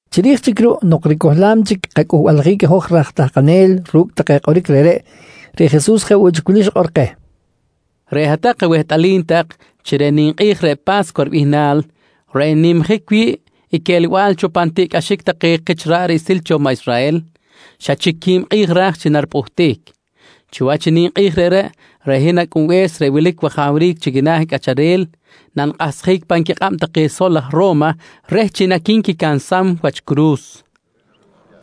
Chiri̱j chic ruꞌ nok ricohlam chic kacꞌulbaljic i hoj raj tahkanel ru̱cꞌ take kꞌoric reꞌreꞌ, reꞌ Jesus jeꞌ woꞌ chic wili xikꞌor keh: «Reꞌ hat-tak awehtꞌalim tak chi reꞌ ninkꞌi̱j reꞌ Pa̱scuwa ribihnal reꞌ n-nimjic wi̱ꞌ i quelbal cho pan tiꞌcꞌaxic take kich ra̱ꞌ riꞌsil cho maꞌ Israhel, xa chic qui̱b kꞌi̱j ra̱j chi naripꞌuhtic. Chiwach i ninkꞌi̱j reꞌreꞌ, reꞌ hin Acꞌunbe̱s reꞌ wilic wajawric chi quina̱ cꞌacharel nanikꞌahsjic pan quikꞌab take sol aj Ro̱ma reh chi naqui̱nquicansam wach curu̱s, nqui xikꞌor keh.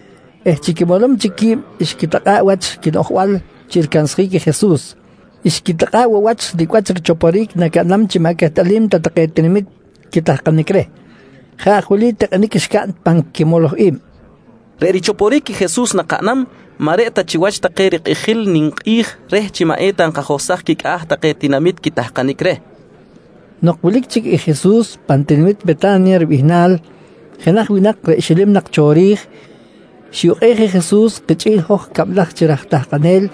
eh chi quimolom chic qui̱b xquitikꞌa̱ꞌ wach quinoꞌjbal chi ricansjic i Jesus. Xquitikꞌa̱ꞌ woꞌ wach nicꞌ wach richoporic nacaꞌnam chi maꞌ quehtꞌalim ta take tinamit quitahkanic reh. Jeꞌ aj wili tikꞌinic xcaꞌn pan quimoloj i̱b: Reꞌ richoporic i Jesus nakaꞌnam maꞌ reꞌ ta chiwach take rikꞌijil ninkꞌi̱j reh chi maꞌ eta nkajohsaj quicꞌa̱ take tinamit quitahkanic reh, nqui tikꞌinic xcaꞌn. Nok wilic chic i Jesus pan tinamit Weta̱nya ribihnal, jenaj winak reꞌ xilim nak cho ri̱j, xiyukꞌej i Jesus kichꞌi̱l hoj cablaj chi raj tahkanel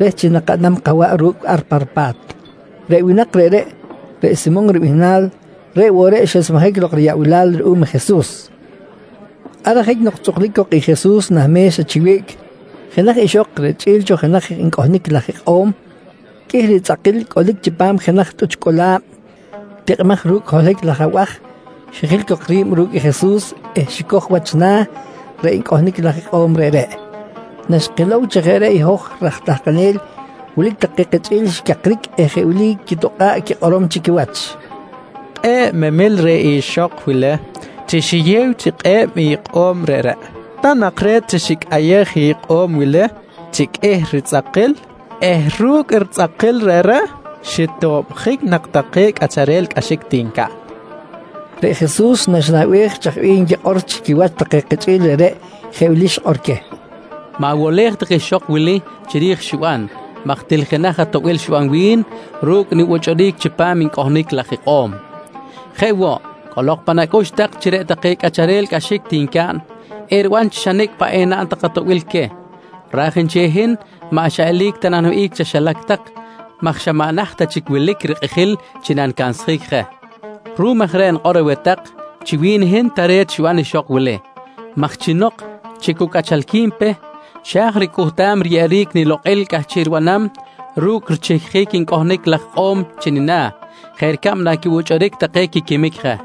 reh chi nakaꞌnam kawaꞌ ru̱cꞌ ar pa ripa̱t. Reꞌ winak reꞌreꞌ, reꞌ Simon ribihnal, reꞌ woꞌ reꞌ xesmejic lok riyaꞌbilal ruꞌum i Jesus. Ar ajic nok tzꞌuklic cok i Jesus nah me̱xa chi wiꞌc, jenaj ixok reꞌ richꞌi̱l cho jenaj ncꞌohnic laj ikꞌo̱m qꞌuih ritzꞌakil cꞌolic chipam jenaj tꞌuch cꞌola̱b tikꞌimaj ru̱cꞌ holohic laj abaj, xijil cok ri̱b ru̱cꞌ i Jesus eh xicoj wach na̱ reꞌ ncꞌohnic laj ikꞌo̱m reꞌreꞌ. Naxkilow chi jeꞌ reꞌ i hoj raj tahkanel, wilic take kichꞌi̱l xicakric eh jeꞌ wili quitokꞌa̱ꞌ quikꞌorom chi quiwach: «Kꞌe̱ꞌ memil reh ixok wili chi xiyew chi kꞌe̱b ikꞌo̱m reꞌreꞌ. Ta nak re̱t chi xicꞌayej ikꞌo̱m wili chi qꞌuih ritzꞌakil eh ru̱cꞌ ritzꞌakil reꞌreꞌ xitobjic nak take cꞌacharel cꞌaxic ti ncaꞌn, nqui take. Reꞌ Jesus, naxinaꞌbej chaj bih nquikꞌor chi quiwach take kichꞌi̱l reꞌreꞌ, jeꞌ wili xikꞌor queh: «Ma̱wolej tak ixok wili chiri̱j i xiban maj til jenaj atoꞌbil xiban wi̱n ru̱cꞌ nibuchꞌuric chipam ncꞌohnic laj ikꞌo̱m. Jeꞌ woꞌ, cꞌolok pan acꞌux tak chi reꞌ take cꞌacharel cꞌaxic ti ncaꞌn, eriban chi xa nicꞌ paꞌ enaꞌn tak atoꞌbil queh, raj nchel i hin maꞌ xa eli̱c ta naniwihꞌic chaxilac tak maj xa maꞌ naht ta chic wilic je rikꞌijil chi nanicansjic je. Ruꞌum aj reꞌ nikꞌor aweh tak chi wi̱n i hin tare̱t xiban ixok wili maj chi nok chi cu cꞌachalqui̱n pe, xa̱j ricꞌuhtam riyeꞌjic nilokꞌil cꞌahchiꞌ ribanam ru̱cꞌ richihcjic ncꞌohnic laj ikꞌo̱m chi nina̱ jeꞌ ricab naquibuchꞌuric take quiquimic je.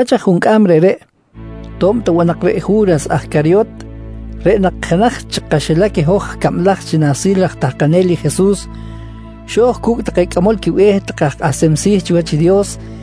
Chiwach aj juncꞌam reꞌreꞌ, to̱b ta woꞌ nak reꞌ Ju̱ras aj Caryot, reꞌ nak jenaj chi kaxilac i hoj cablaj chi nahsil raj tahkanel i Jesus, xo̱j cu̱cꞌ take cꞌamol quibe̱h take aj kꞌahsem si̱ chiwach i Dios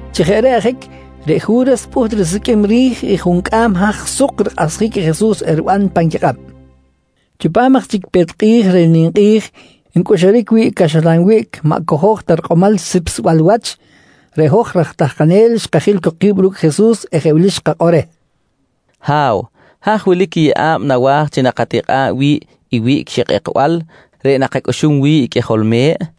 Chi jeꞌ reꞌ ajic, reꞌ Ju̱ras pꞌuht risiqꞌuim ri̱j i juncꞌam haj suk rikꞌahsjic i Jesus eriban pan quikꞌab. Chipam aj chic i pe̱t kꞌi̱j reh ninkꞌi̱j ncꞌuxuric wi̱ꞌ i caxlan wiꞌc maꞌ cojo̱j ta rikꞌomal sipsbal wach, reꞌ hoj aj tahkanel xkajil cok ki̱b ru̱cꞌ i Jesus eh jeꞌ wili xkakꞌor reh: «Ha̱w, haj wilic i yeꞌa̱b nawa̱j chi nakatikꞌa̱b wi̱ꞌ i wiꞌc xikꞌekbal reꞌ nakacꞌuxum wi̱ꞌ i qꞌuijol me̱ꞌ? kojqui reh.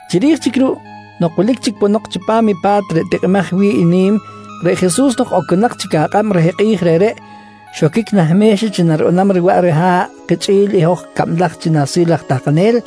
Chiri̱j chic ruꞌ nok wilic chic ponok chipam i pa̱t reꞌ tikꞌimaj wi̱ꞌ i nim, reꞌ Jesus nok oconak chic akꞌab reh kꞌi̱j reꞌreꞌ, xoquic nah me̱xa chi naribanam riwaꞌ riha̱ꞌ kichꞌi̱l i hoj cablaj chi nahsil raj tahkanel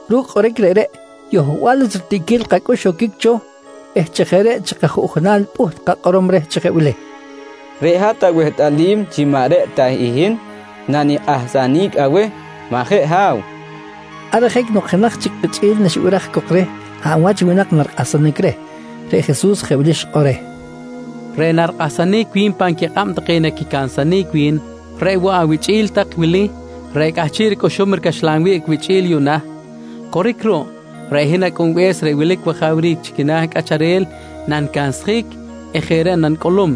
Ru̱cꞌ kꞌoric reꞌreꞌ, yohbal wach ritiꞌquil kacꞌux xoquic cho eh chi jeꞌ reꞌ chi kajuꞌjunal pꞌuht kakꞌorom reh chi jeꞌ wili: «Reꞌ hat awehtꞌalim chi maꞌ reꞌ ta i hin nanikꞌahsanic aweh, majeꞌ Ha̱w? kojqui reh. Ar ajic nok jenaj chic kichꞌi̱l naxibiraj cok reh hab wach i winak narikꞌahsanic reh, reꞌ Jesus jeꞌ wili xikꞌor reh: «Reꞌ narikꞌahsanic wi̱n pan quikꞌab take naquicansanic wi̱n, reꞌ woꞌ awichꞌi̱l tak wili reꞌ cꞌahchiꞌ ricꞌuxum ricaxlan wiꞌc wichꞌi̱l yuꞌna. Coric ruꞌ, reꞌ hin Acꞌunbe̱s reꞌ wilic wajawric chi quina̱ cꞌacharel nanicansjic eh jeꞌ reꞌ nanicꞌulum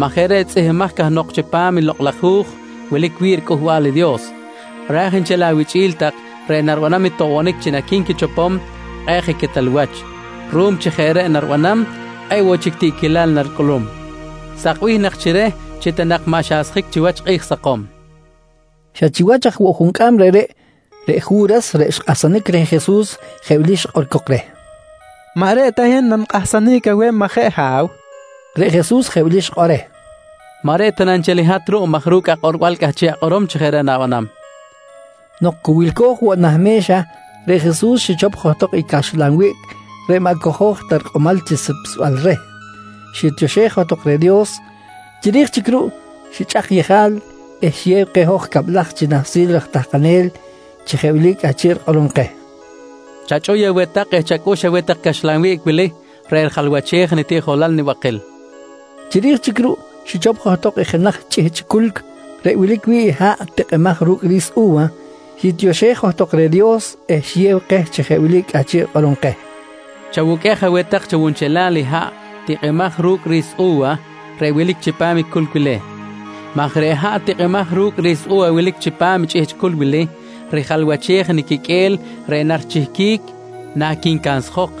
maj jeꞌ reꞌ tzꞌihmbimaj cahnok chipam i Lokꞌ laj Hu̱j wilic wi̱ꞌ riCꞌuhbal i Dios, raj nchel awichꞌi̱l tak reꞌ naribanam i toꞌbonic chi naqui̱nquichopom, kꞌe̱ꞌ je quetal wach. Ruꞌum chi jeꞌ reꞌ naribanam, kꞌe̱ꞌ woꞌ chic tiꞌquilal naricꞌulum. Sakbih nak chi reh chi maꞌ ta nak xasjic chiwach kꞌi̱j sakom, nqui Jesus. Xa chiwach aj woꞌ juncꞌam reꞌreꞌ, reꞌ Ju̱ras reꞌ xkꞌahsanic reh Jesus, jeꞌ wili xikꞌor cok reh: «Maꞌ reꞌ ta i hin nanikꞌahsanic aweh, majeꞌ Ha̱w? nqui cok reh. Reꞌ Jesus jeꞌ wili xikꞌor reh: «Maꞌ reꞌ ta na nchel i hat ruꞌ maj ru̱cꞌ akꞌorbal cꞌahchiꞌ akꞌorom chi jeꞌ reꞌ na̱banam, nqui reh. Nok cu wilco̱j woꞌ nah me̱xa, reꞌ Jesus xichop johtok i caxlan wiꞌc reꞌ maꞌ cojo̱j ta rikꞌomal chi sipsbal reh, xitioxej johtok reh Dios. Chiri̱j chic ruꞌ xichꞌak yejal eh xiyew keh hoj cablaj chi nahsil raj tahkanel chi jeꞌ wili cꞌahchiꞌ rikꞌorom keh: «Chachꞌuy aweh tak eh chacꞌux aweh tak i caxlan wiꞌc wili reꞌ rijalwachej i nitiꞌjolal nibakil, nqui keh. Chiri̱j chic ruꞌ xichop johtok i jenaj chꞌihchꞌ culc reꞌ wilic wi̱ꞌ i haꞌ tikꞌimaj ru̱cꞌ ri̱s u̱wa, xitioxej johtok reh Dios eh xiyew keh chi jeꞌ wili cꞌahchiꞌ rikꞌorom keh: «Chawuqꞌuej aweh tak chawunchelal i haꞌ tikꞌimaj ru̱cꞌ ri̱s u̱wa reꞌ wilic chipam i culc wili. Jeꞌ reꞌ chaꞌn tak maj reꞌ haꞌ tikꞌimaj ru̱cꞌ ri̱s u̱wa wilic chipam i chꞌihchꞌ culc wili, rijalwachej i niquiqꞌue̱l reꞌ narichihquic naquincansjok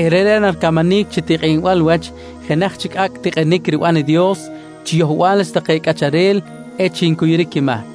eh reꞌreꞌ naricamanic chi tikꞌinbal wach i jenaj chic acꞌ tikꞌinic riban i Dios chi yohbal wach cꞌacharel echic ncuyuric quimahc.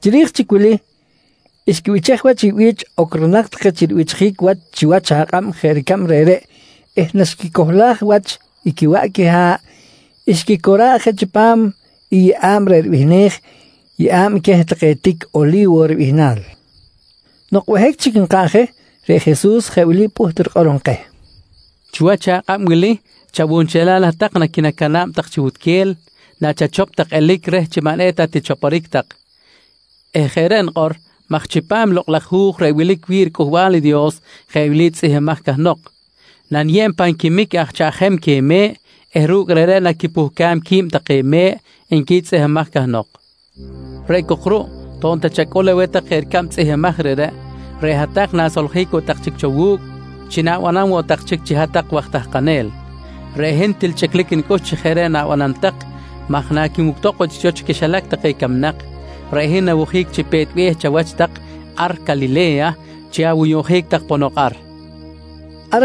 Chiri̱j chic wili, xquibichej wach i bi̱ch ocronak take chi ribichjic wach chiwach akꞌab jeꞌ ricab reꞌreꞌ eh naxquicohlaj wach i quiwaꞌ quiha̱ꞌ xquicora̱ꞌ je chipam i yeꞌa̱b reꞌ ribihnej “Yeꞌa̱b queh take tic Oli̱wo ribihnal”. Nok behic chic nkaꞌn je, reꞌ Jesus jeꞌ wili pꞌuht rikꞌorom keh: «Chiwach akꞌab wili chawunchelal hat-tak naquinacana̱b tak chi wutquel nachachop tak elic reh chi maꞌ eta tichoporic tak eh jeꞌ reꞌ nikꞌor maj chipam i Lokꞌ laj Hu̱j reꞌ wilic wi̱ꞌ riCꞌuhbal i Dios jeꞌ wili tzꞌihmbimaj cahnok: “Naniyeb pan quimic aj chaꞌjem queh me̱ꞌ eh ru̱cꞌ reꞌreꞌ naquipuhcam qui̱b take me̱ꞌ, nqui tzꞌihmbimaj cahnok. «Reꞌ cok ruꞌ, to̱b ta chacꞌul aweh tak jeꞌ ricab tzꞌihmbimaj reꞌreꞌ, reꞌ hat-tak na̱soljic woꞌ tak chic cho wu̱cꞌ chi na̱banam woꞌ tak chic chi hat-tak waj tahkanel. Reꞌ hin til chꞌiclic nicꞌux chi jeꞌ reꞌ na̱banam tak maj naquinuctok woꞌ chic cho chi quixilac take camnak, reꞌ hin nawojic chi pe̱t be̱h chawach tak ar Calile̱ya chi awuyuꞌnjic tak ponok ar, nqui keh.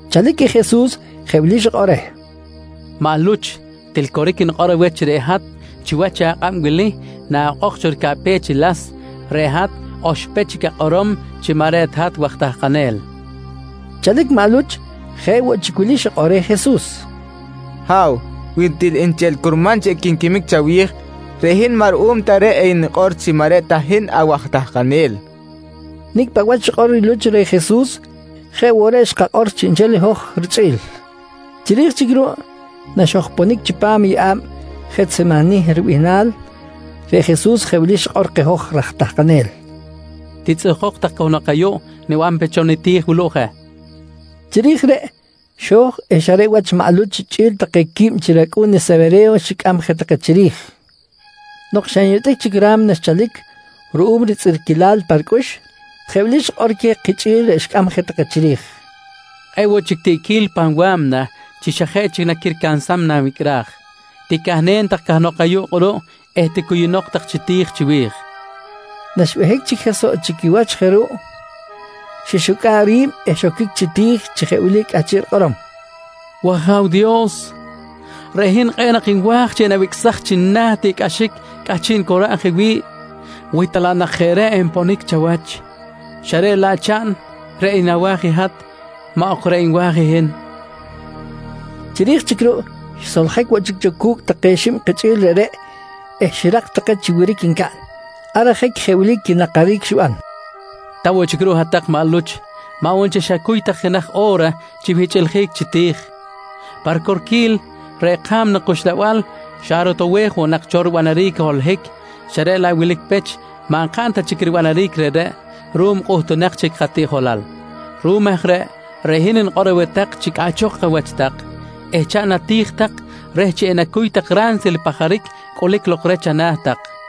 Chalic i Jesus jeꞌ wili xikꞌor reh: «Maꞌ Luch, til coric nikꞌor chi reꞌ hat chiwach i chakꞌab wili naꞌokꞌok cho ricaꞌpech i las, reꞌ hat oxpech chic akꞌorom chi maꞌ reꞌ ta hat waj tahkanel, nqui reh. Chalic maꞌ Luch, jeꞌ woꞌ chic wili xikꞌor reh Jesus: «Ha̱w, wi til nchel curman chi equinquimic chawi̱j, reꞌ hin maꞌ ruꞌum ta reꞌ enikꞌor chi maꞌ reꞌ ta hin awaj tahkanel, nqui reh. Nicꞌ paꞌ wach xikꞌor i Luch reh Jesus, jeꞌ woꞌ reꞌ xkakꞌor chiꞌnchel i hoj richꞌi̱l. Chiri̱j chic ruꞌ naxojponic chipam i yeꞌa̱b Jetsemanih ribihnal, reꞌ Jesus jeꞌ wili xikꞌor keh hoj raj tahkanel: «Titzꞌuhkok tak cahnok ayuꞌ, niban pe cho niti̱j wuluꞌ je, nqui keh. Chiri̱j reꞌ, xo̱j eh xa reꞌ wach maꞌ Luch chꞌi̱l take quib chi racꞌu̱n Sewere̱yo xicꞌam je take chiri̱j. Nok xa nyotꞌic chic i ra̱mna xchalic ruꞌum ritzꞌirquilal pa ricꞌux, jeꞌ wili xikꞌor queh kichꞌi̱l reꞌ xicꞌam je take chiri̱j: «Kꞌe̱ꞌ woꞌ chic tiꞌquil pan wa̱mna chi xa jeꞌ chic naquiricansam nanwicꞌraj. Ticahnen tak cahnok ayuꞌ kꞌuruꞌ eh ticuyunok tak chi ti̱j chiwi̱j, nqui queh. Naxbehic chic je soꞌ chi quiwach je ruꞌ, xixucꞌa̱ꞌ ri̱b eh xoquic chi ti̱j chi jeꞌ wili cꞌahchiꞌ rikꞌorom: «W-Aja̱w Dios, reꞌ hin kꞌe̱ꞌ nak nwa̱j chi enawicꞌsaj chi nina̱ i tiꞌcꞌaxic cꞌahchiꞌ nicora̱b je wi̱ꞌ wi ta laꞌ nak jeꞌ reꞌ enponic chawach, xa reꞌ laꞌ chaꞌn reꞌ nawa̱j i hat, maꞌ ok reꞌ nwa̱j i hin, nqui johtok pa riti̱j. Chiri̱j chic ruꞌ, xsoljic woꞌ chic cho cu̱cꞌ take xib kichꞌi̱l reꞌreꞌ eh xirak take chi wiric ncaꞌn. Ar ajic jeꞌ wili quinakaric xiban: «Ta woꞌ chic ruꞌ i hat maꞌ Luch, maꞌ woꞌ nchel xacuy tak jenaj o̱ra chi wihchꞌiljic chi ti̱j? Pa ricorquil, reꞌ ka̱mna kuxlabal xa rotowej woꞌ nak cho ribanaric i holohic xa reꞌ laꞌ wilic pech maꞌ nkaꞌn ta chic ribanaric reꞌreꞌ ruꞌum kꞌuhtunak chic katiꞌjolal. Ruꞌum aj reꞌ, reꞌ hin nikꞌor aweh tak chi cꞌaꞌchok awach tak eh chaꞌn ati̱j tak reh chi enacuy tak ransil i pajaric cꞌulic lok reh chana̱ tak, nqui queh.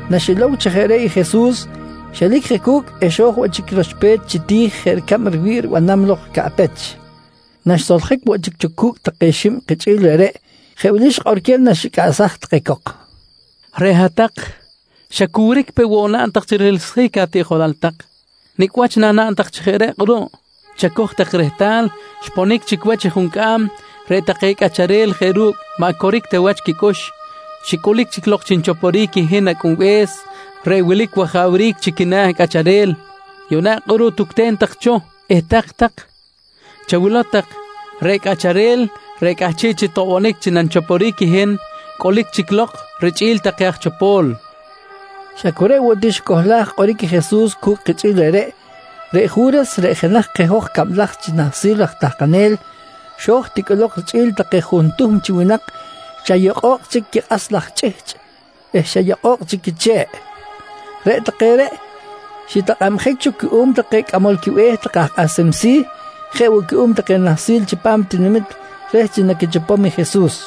Naxilow chi jeꞌ reꞌ i Jesus xelic je cu̱cꞌ eh xo̱j woꞌ chic roxpech chi ti̱j chi jeꞌ ricab riwi̱ꞌ ribanam lok caꞌpech. Naxsoljic woꞌ chic cho cu̱cꞌ take xib kichꞌi̱l reꞌreꞌ, jeꞌ wili xikꞌor queh naxicꞌaꞌsaj take cok: «Reꞌ hat-tak xa cu wiric peꞌ woꞌ naꞌn tak chi rihiꞌlsjic atiꞌjolal tak! Nicꞌ wach nanaꞌn tak chi jeꞌ reꞌ kꞌuruꞌ? Chacoj tak rehtal, xponic chic wach i juncꞌam reꞌ take cꞌacharel jeꞌ ru̱cꞌ maꞌ coric ta wach quicꞌux, xicꞌulic lok chi nichoporic i hin Acꞌunbe̱s reꞌ wilic wajawric chi quina̱ cꞌacharel. Yuꞌna kꞌuruꞌ tucten tak cho eh tak-tak. Chawilow tak, reꞌ cꞌacharel reꞌ cꞌahchiꞌ chi toꞌbonic chi nanichoporic i hin, cꞌulic chic lok richꞌi̱l take aj chopo̱l, nqui queh. Xa cu reꞌ woꞌ ti xicohlaj kꞌoric i Jesus cu̱cꞌ kichꞌi̱l reꞌreꞌ, reꞌ Ju̱ras reꞌ jenaj keh hoj cablaj chi nahsil raj tahkanel, xo̱j ti cꞌolok richꞌi̱l take juntuhm chi winak xa yokꞌo̱kꞌ chic quikꞌas laj chꞌihchꞌ eh xa yokꞌo̱kꞌ chic quiche̱ꞌ. Reꞌ take reꞌ xitakꞌabjic cho cuꞌum take cꞌamol quibe̱h take aj kꞌahsem si̱, jeꞌ woꞌ cuꞌum take nahsil chipam tinamit reh chi naquichopom i Jesus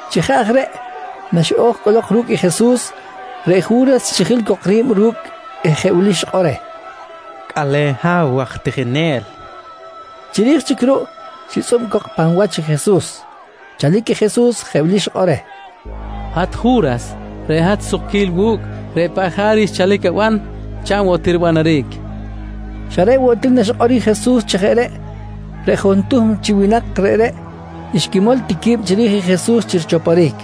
Chi jeꞌ aj reꞌ naxiꞌo̱j cꞌolok ru̱cꞌ i Jesus, reꞌ Ju̱ras xijil cok ri̱b ru̱cꞌ eh jeꞌ wili xikꞌor reh: «Cꞌale̱n Ha̱w waj tijinel, nqui reh. Chiri̱j chic ruꞌ xitzꞌub cok i pan wach i Jesus. Chalic i Jesus jeꞌ wili xikꞌor reh: «Hat Ju̱ras, reꞌ hat sukquil wu̱cꞌ. Reꞌ paꞌ jaric xchalic aban, chaꞌn woꞌ ti ribanaric, nqui reh. Xa reꞌ woꞌ ti naxikꞌor i Jesus chi jeꞌ reꞌ, reꞌ juntuhm chi winak reꞌreꞌ xquimol ti qui̱b chiri̱j i Jesus chi richoporic.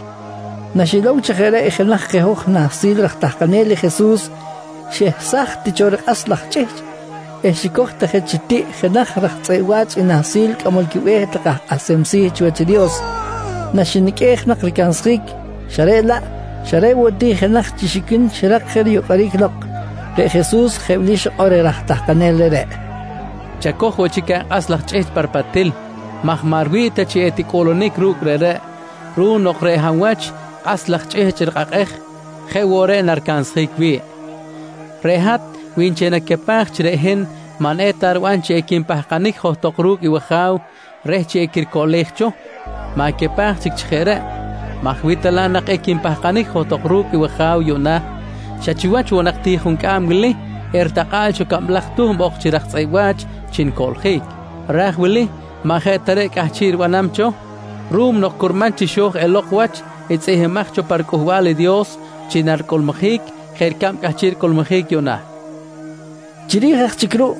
Naxilow chi jeꞌ reꞌ i jenaj keh hoj nahsil raj tahkanel i Jesus, xehsaj ti cho rikꞌas laj chꞌihchꞌ eh xicoj ti je chi tiꞌ jenaj raj tzꞌeꞌ wa̱ch i nahsil cꞌamol quibe̱h take aj kꞌahsem si̱ chiwach i Dios, naxiniqꞌuej nak ricansjic xa reꞌ laꞌ, xa reꞌ woꞌ ti i jenaj chi xiquin xirak je riyocꞌoric lok. Reꞌ Jesus jeꞌ wili xikꞌor reh raj tahkanel reꞌreꞌ: «Chacoj woꞌ chic akꞌas laj chꞌihchꞌ pa ripatil maj maꞌ riwi̱ꞌ ta chi ticꞌuꞌlunic ru̱cꞌ reꞌreꞌ ruꞌum nok reꞌ hab wach kꞌas laj chꞌihchꞌ rikꞌakꞌej, jeꞌ woꞌ reꞌ naricansjic wi̱ꞌ. Reꞌ hat wi nchel nacapaj chi reꞌ hin maꞌ eta riban chi equinpahkanic johtok ru̱cꞌ wAja̱w reh chi equiricoꞌlej cho, ma̱capaj chic chi jeꞌ reꞌ maj wi ta laꞌ equinpahkanic johtok ru̱cꞌ i wAja̱w yuꞌna, xa chiwach woꞌ nak ti juncꞌam wili eritakꞌa̱ꞌ cho cablaj tuhm ok chi raj tzꞌeꞌ wa̱ch chi nicoꞌljic. Raj wili maꞌ jeꞌ ta reꞌ cꞌahchiꞌ ribanam cho ruꞌum nok curman chi xo̱j elok wach i tzꞌihmbimaj cho pa riCꞌuhbal i Dios chi naricꞌuluric jeꞌ ricab cꞌahchiꞌ ricꞌulmujic yuꞌna, nqui Jesus reh. Chiri̱j aj chic ruꞌ,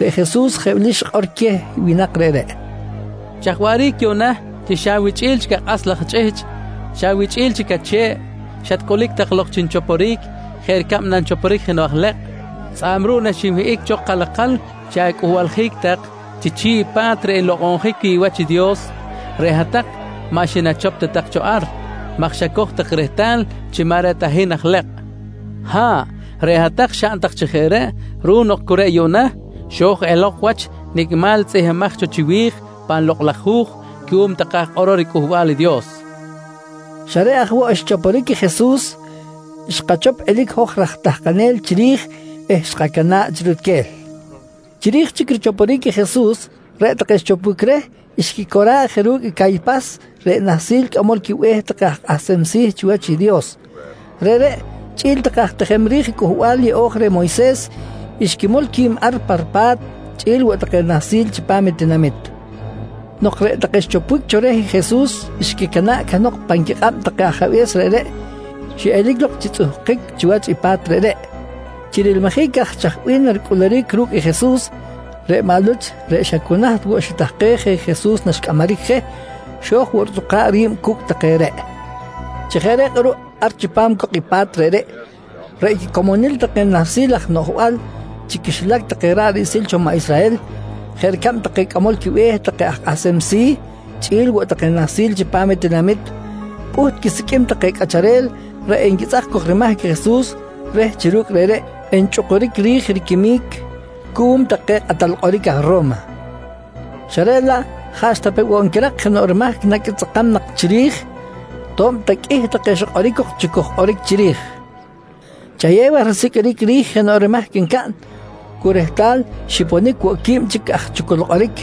reꞌ Jesus jeꞌ wili xikꞌor queh winak reꞌreꞌ: «Chaj waꞌric yuꞌna chi xa awichꞌi̱l chic akꞌas laj chꞌihchꞌ, xa awichꞌi̱l chic ache̱ꞌ, xatcꞌulic tak lok chi nichoporic jeꞌ ricab nanchoporic jenoꞌ aj lekꞌ? Tzꞌa̱b ruꞌ naxinwihꞌic cho kalakal chi acꞌuhbaljic tak chi chi̱ꞌ i pa̱t reꞌ nlokꞌonjic wi̱ꞌ wach i Dios, reꞌ hat-tak maꞌ xinachop ta tak cho ar maj xacoj tak rehtal chi maꞌ reꞌ ta hin aj ilekꞌ. Ha̱ꞌ, reꞌ hat-tak xaꞌn tak chi jeꞌ reꞌ ruꞌum nok cu reꞌ yuꞌna xo̱j elok wach nicꞌ nimal tzꞌihmbimaj cho chiwi̱j pan Lokꞌ laj Hu̱j cuꞌum take aj kꞌorol riCꞌuhbal i Dios, nqui queh tinamit reꞌreꞌ. Xa reꞌ aj woꞌ xchoporic i Jesus, xkachop elic i hoj raj tahkanel chiri̱j eh xkacana̱ꞌ chi rutquel. Chiri̱j chic richoporic i Jesus, reꞌ take xichopbic reh xquicora̱ꞌ je ru̱cꞌ i Caypas reꞌ nahsil cꞌamol quibe̱h take aj kꞌahsem si̱ chiwach i Dios. Reꞌreꞌ chꞌi̱l take aj tijem ri̱j Cꞌuhbal Yeꞌo̱j reh Moyses xquimol qui̱b ar pa ripa̱t chꞌi̱l woꞌ take nahsil chipam tinamit. Nok reꞌ take xichopbic cho reh Jesus xquicana̱ꞌ cahnok pan quikꞌab take ajabe̱s reꞌreꞌ, xiꞌelic lok chi tzꞌuhkic chiwach i pa̱t reꞌreꞌ. Chi rilmijic aj chaj bih naricꞌuluric ru̱cꞌ Jesus, reꞌ maꞌ Luch reꞌ xa cu naht woꞌ xitahkej je i Jesus naxcꞌamaric je, xo̱j woꞌ ritzꞌukꞌa̱b ri̱b cu̱cꞌ take reꞌ. Chi jeꞌ reꞌ kꞌuruꞌ ar chipam cok i pa̱t reꞌreꞌ, reꞌ quicomonil take nahsil aj noꞌjbal chi quixilac take ra̱ꞌ riꞌsil cho maꞌ Israhel jeꞌ ricab take cꞌamol quibe̱h take aj kꞌahsem si̱, chꞌi̱l woꞌ take nahsil chipam i tinamit, pꞌuht quisiqꞌuim take cꞌacharel reꞌ enquitzꞌak cok rimahc i Jesus reh chi ru̱cꞌ reꞌreꞌ enchꞌukuric ri̱j riquimic cuꞌum take kꞌatal kꞌoric aj Ro̱ma, xa reꞌ laꞌ jaꞌxta pe woꞌ nquirak jenoꞌ rimahc naquitzꞌakam nak chiri̱j, to̱b ta qꞌuih take xikꞌoric cok chucuj kꞌoric chiri̱j. Chayew aj risiqꞌuiric ri̱j jenoꞌ rimahc ncaꞌn, cu rehtal xiponic woꞌ i qui̱b chic aj chucul kꞌoric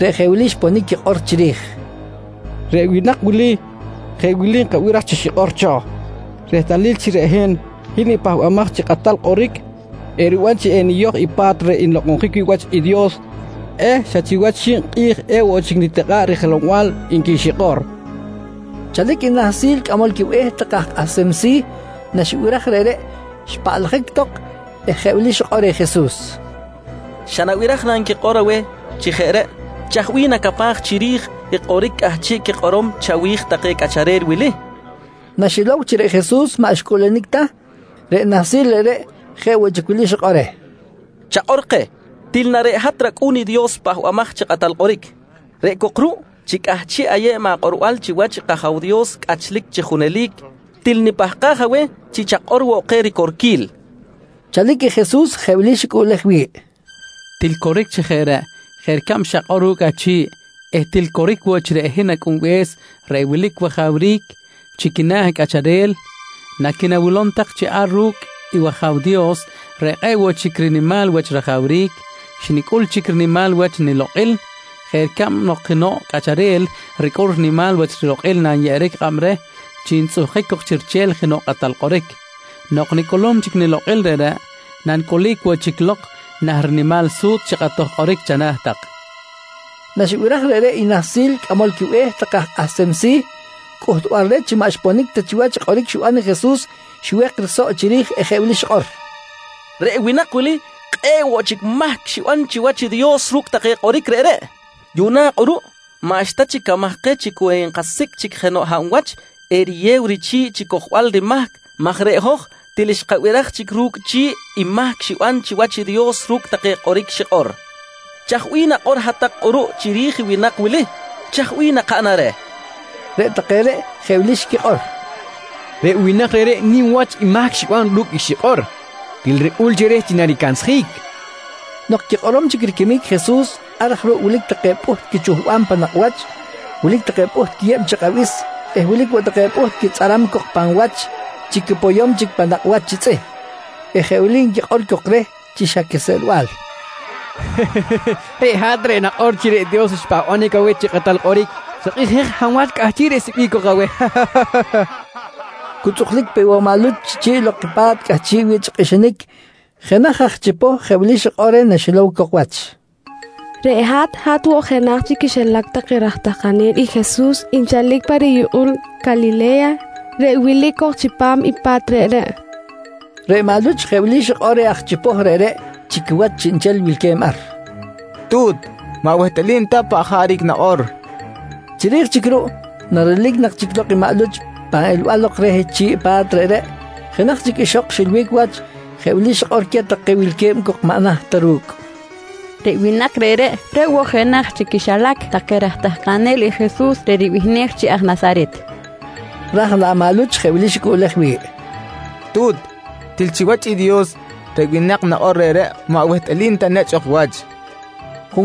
reꞌ jeꞌ wili xponic quikꞌor chiri̱j: «Reꞌ winak wili jeꞌ wili nkabiraj chi xikꞌor cho: Rehtalil chi reꞌ hin, hin i Pahbamaj chi Kꞌatal Kꞌoric, eriban chi eniyoj i pa̱t reꞌ nlokꞌonjic wi̱ꞌ wach i Dios eh xa chiwach xib kꞌi̱j ewoꞌ chic enitikꞌa̱ꞌ rijelow-bal, nqui xikꞌor, nqui take cok. Chalic i nahsil cꞌamol quibe̱h take aj kꞌahsem si̱, naxibiraj reꞌreꞌ, xpaꞌlajic tok eh jeꞌ wili xikꞌor reh Jesus: «Xa nabiraj na nquikꞌor aweh chi jeꞌ reꞌ? Chaj bih nacapaj chiri̱j i kꞌoric cꞌahchiꞌ quikꞌorom chawi̱j take cꞌacharel wili? nqui reh. Naxilow chi reꞌ Jesus maꞌ xcꞌuꞌlunic ta, reꞌ nahsil reꞌreꞌ jeꞌ woꞌ chic wili xikꞌor reh: «Chakꞌor keh, til na reꞌ hat rAcꞌu̱n i Dios Pahbamaj chi Kꞌatal Kꞌoric. Reꞌ cok ruꞌ chi cꞌahchiꞌ ayeb akꞌorbal chiwach i kAja̱w Dios cꞌachlic chi junelic, til nipahkaj aweh chi chakꞌor woꞌ keh ricorquil, nqui xikꞌor reh. Chalic i Jesus jeꞌ wili xicꞌuꞌlej wi̱ꞌ: «Til coric chi jeꞌ reꞌ jeꞌ ricab xakꞌor ru̱cꞌ achi̱ꞌ eh til coric woꞌ chi reꞌ hin Acꞌunbe̱s reꞌ wilic wajawric chi quina̱ cꞌacharel, naqui̱nawilom tak chi ar ru̱cꞌ i wAja̱w Dios reꞌ kꞌe̱ꞌ woꞌ chic rinimal wach rajawric, xnicꞌul chic rinimal wach nilokꞌil jeꞌ ricab nok jenoꞌ cꞌacharel ricꞌul rinimal wach rilokꞌil nanyeꞌeric kꞌab reh chi ntzꞌuhkic cok chi riche̱l jenoꞌ kꞌatal kꞌoric. Nok nicꞌulum chic nilokꞌil reꞌreꞌ, nanicꞌulic woꞌ chic lok nah rinimal su̱tzꞌ chi kꞌatoj kꞌoric chana̱ tak, nqui queh. Naxibiraj reꞌreꞌ i nahsil cꞌamol quibe̱h take aj kꞌahsem si̱, cꞌuhtbal reh chi maꞌ xponic ta chiwach i kꞌoric xiban i Jesus xiwek i risoꞌ chiri̱j eh jeꞌ wili xikꞌor: «Reꞌ winak wili kꞌe̱ꞌ woꞌ chic mahc xiban chiwach i Dios ru̱cꞌ take kꞌoric reꞌreꞌ. Yuꞌna kꞌuruꞌ maꞌxta chic camaj keh chi cu enkasicꞌ chic jenoꞌ hab wach eriyew richi̱ꞌ chi cojbal rimahc maj reꞌ hoj til xkabiraj chic ru̱cꞌ chi̱ꞌ i mahc xiban chiwach i Dios ru̱cꞌ take kꞌoric xikꞌor. Chaj bih nakꞌor hat-tak kꞌuruꞌ chiri̱j i winak wili? Chaj bih nakaꞌnam reh? nqui queh richꞌi̱l. Reꞌ take reꞌ jeꞌ wili xquikꞌor: «Reꞌ winak reꞌreꞌ nim wach i mahc xiban ru̱cꞌ i xikꞌor. Til ricꞌul chi reh chi naricansjic, nqui take. Nok quikꞌorom chic riquimic i Jesus, ar aj ruꞌ wilic take pꞌuht quichuhbam pan nakꞌ wach, wilic take pꞌuht quiyeb chi kꞌabis eh wilic woꞌ take pꞌuht quitzꞌaram cok pan wach chi quipoyom chic pan nakꞌ wach chi tzꞌih eh jeꞌ wili nquikꞌor cok reh chi xa quiseꞌlbal: «Reꞌ hat reꞌ nakꞌor chi reꞌ Dios xpahbanic aweh chi kꞌatal kꞌoric, chakꞌijej hab wach cꞌahchiꞌ risecꞌbic cok aweh, nqui take reh. Cu tzꞌuklic pe woꞌ maꞌ Luch chi chi̱ꞌ lok i pa̱t cꞌahchiꞌ wi̱ꞌ chi kꞌixinic, jenaj aj chipoh jeꞌ wili xikꞌor reh naxilow cok wach: «Reꞌ hat, hat woꞌ jenaj chi quixilac take raj tahkanel i Jesus nchalic pa riyukꞌul Calile̱ya, reꞌ wilic cok chipam i pa̱t reꞌreꞌ, nqui reh. Reꞌ maꞌ Luch jeꞌ wili xikꞌor reh aj chipoh reꞌreꞌ chi quiwach chiꞌnchel wilque̱b ar: «Tu̱t, maꞌ wehtꞌalim ta paꞌ jaric nakꞌor, nqui reh. Chiri̱j chic ruꞌ, narelic nak chic lok i maꞌ Luch pan elbal lok reh chi̱ꞌ pa̱t reꞌreꞌ, jenaj chic ixok xilbic wach jeꞌ wili xikꞌor queh take wilque̱b cok maꞌ naht ta ru̱cꞌ: «Reꞌ winak reꞌreꞌ, reꞌ woꞌ jenaj chi quixilac take raj tahkanel i Jesus reꞌ ribihnej chi aj Nasaret! nqui xikꞌor queh. Raj laꞌ maꞌ Luch jeꞌ wili xicꞌuꞌlej wi̱ꞌ: «Tu̱t, til chiwach i Dios, reꞌ winak nakꞌor reꞌreꞌ maꞌ wehtꞌalim ta nechꞌ ok wach, nqui xicꞌuꞌlej wi̱ꞌ.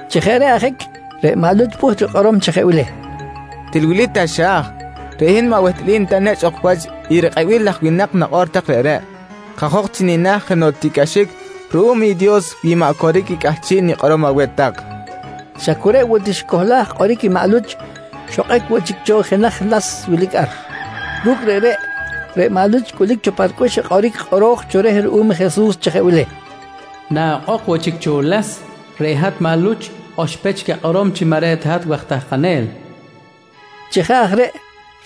Chi jeꞌ reꞌ ajic reꞌ maꞌ Luch pꞌuht rikꞌorom chi jeꞌ wili: «Til wili taxa̱j, reꞌ hin maꞌ wehtꞌalim ta nechꞌ ok wach i rikꞌebil laj winak nakꞌor tak reꞌreꞌ. Kajok chi nina̱ jenoꞌ tiꞌcꞌaxic ruꞌum i Dios wi maꞌ coric i cꞌahchiꞌ nikꞌorom aweh tak, nqui queh. Xa cu reꞌ woꞌ ti xicohlaj kꞌoric i maꞌ Luch, xokꞌic woꞌ chic cho i jenaj las wilic ar. Ru̱cꞌ reꞌreꞌ, reꞌ maꞌ Luch xcꞌulic cho pa ricꞌux i kꞌoric kꞌoro̱j cho reh ruꞌum Jesus chi jeꞌ wili: «Na okꞌok woꞌ chic cho i las, reꞌ hat maꞌ Luch oxpech chic akꞌorom chi maꞌ reꞌ ta hat waj tahkanel, nqui kꞌoro̱j cho reh. Chi jeꞌ aj reꞌ,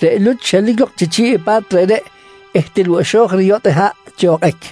reꞌ Luch xelic lok chi chi̱ꞌ i pa̱t reꞌreꞌ eh til woꞌ xo̱j riyotꞌ haꞌ chi okꞌic.